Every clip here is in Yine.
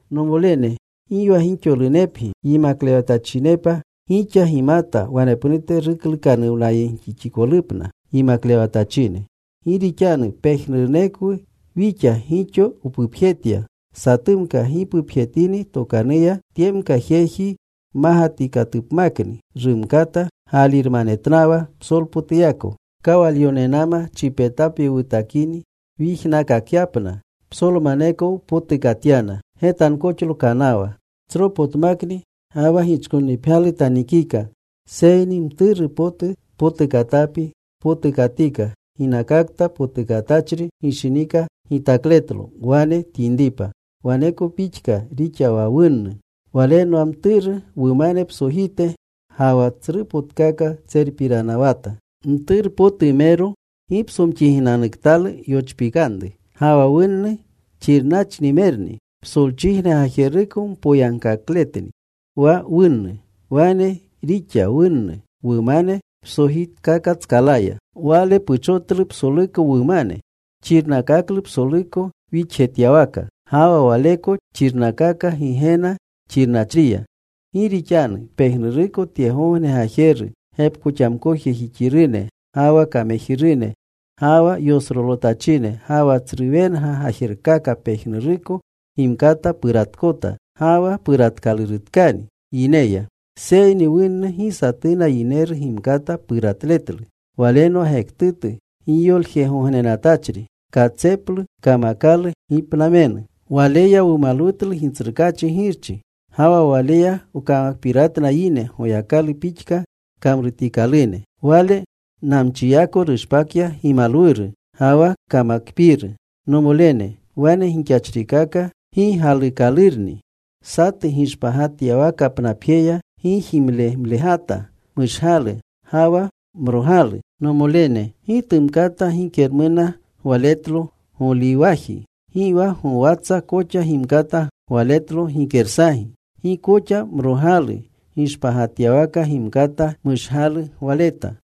Nomolene, gi wa gixolunepgi yimaklewatachinepa. Gixa gimata wanepnute giklukanuwnayegjixpotutko yimaklewatachine. Gi rixanu pejnurunekwu wixa gixo wpupjetya. Satumka gi pupjetini tokanuya, tyemka jeji mmagatikatupmakni. Rumkata gaalirmanetnawa psolpotuyako. Kawalyonenama chipetapi wutakini wyijnaakakyapna, psolmaneko wpotukatyana. Getankoxlo kanawa. Tsropotmakni, ga wa gichkonnipgyalu tanikika. Seyni mturu potu potukatapi tpotukatika ginakakta potukatachri gishinika gitakletlo, wane tyinripa. Waneko pixka rixa wa wunnu. Walenwa mturu wumane psojite, ga wa tsrupotkaka tserpiranawata. Mturpotumero gipsomxiginanuktalu yochpikanru. Ga wa wunnu xirnachrimerni. Psolchijne gajeruko mpoyagkakleni wa wunnu. Wane rixa wunnu wumane psojitkakatskalaya. Wale puchotlu psoluko wumane. Xirnakaklu psoluko wixjetyawaka. Ga wa waleko xirnakaaka Gigena xirnachriya. Gi rixanu pejnuruko tyegogne gajeru, gepkoxamkojejixirune, ga wa kamejirune, ga wa yosrolotachine, ga wa tsru wenga gajerkaka pejnuruko gimkata puratkota ga wa puratkalurutkani yineya. Seyni wunnu gi satuuna yineru gimkata puratletlu. Walenwa gektutu giyoljegognenatachri. Katseplu kamakalu gipnamenu. Waleya wumalwutlu Gitsrukaachi Girchi. Ga wa waleya wkamakpiratna yine, Goyakalu pixka kamrutikalune. Wale namchiyako rushpakya gimalwuru ga wa kamakpiiru. Nomolene, wane gixachrikaka gi galuukalurni. Satu gishpagatyawakapnapjeya gi jimlemlegata mushgalu ga wa mrogalu Nomolene, gi tumkata gikermuna gwaletlo goliwaji. Gi wa gowatsa koxa gimkata gwaletlo gikersagi. Gi koxa mrogalu gishpagatyawaka gimkata mushgalu gwaleta.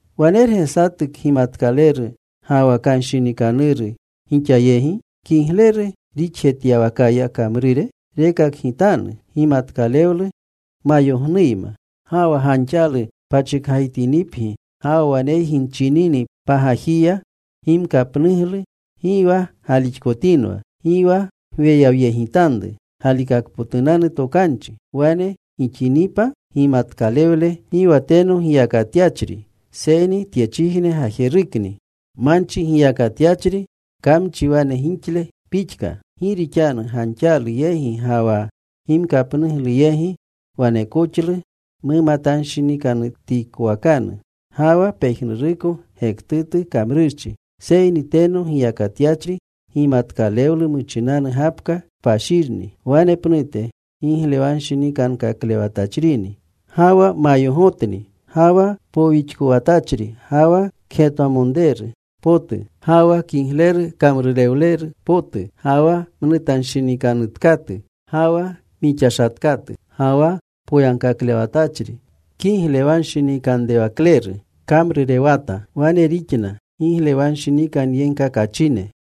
¿Wanerge satu kgimatkaleru ga wa kanshinikanuru gixa yegi? Kigleru rixjetyawakaya kamrure rekakgitanu gimatkalewlu mayognuyma. Ga wa ganxalu pachikgajitinipgi ga wa waneygi nchinini pagajiya gimkapnuglu, gi wa galixkotinwa. Gi wa gweyawyegitanru galikakpotunanu tokanchi. Wane gixinipa gimatkalewle gi wa teno giyakatyachri, seyni tyechijne gajerukni. Manchi giyakatyachri, kamchi wane gixle pixka. Gi rixanu ganxalu yegi ga wa gimkapnuglu yegi, wanekoxlu mumatanshinikanutikowakanu, ga wa pejnuruko gektutu kamrurchi. Seyni teno giyakatyachri gimatkalewlu muchinanu gapka kpashirni. Wanepnute giglewanshinikankaklewatachrini. Ga wa mayogotni, ga wa powixkowatachri, ga wa kgetwamonreru potu, ga wa kigleru kamrurewleru potu, ga wa mnutanshinikanutkatu, ga wa mixashatkatu. Ga wa poyagkaklewatachri kiglewanshinikanrewakleru kamrurewata. Wane rixna giglewanshinikanyegkakachine.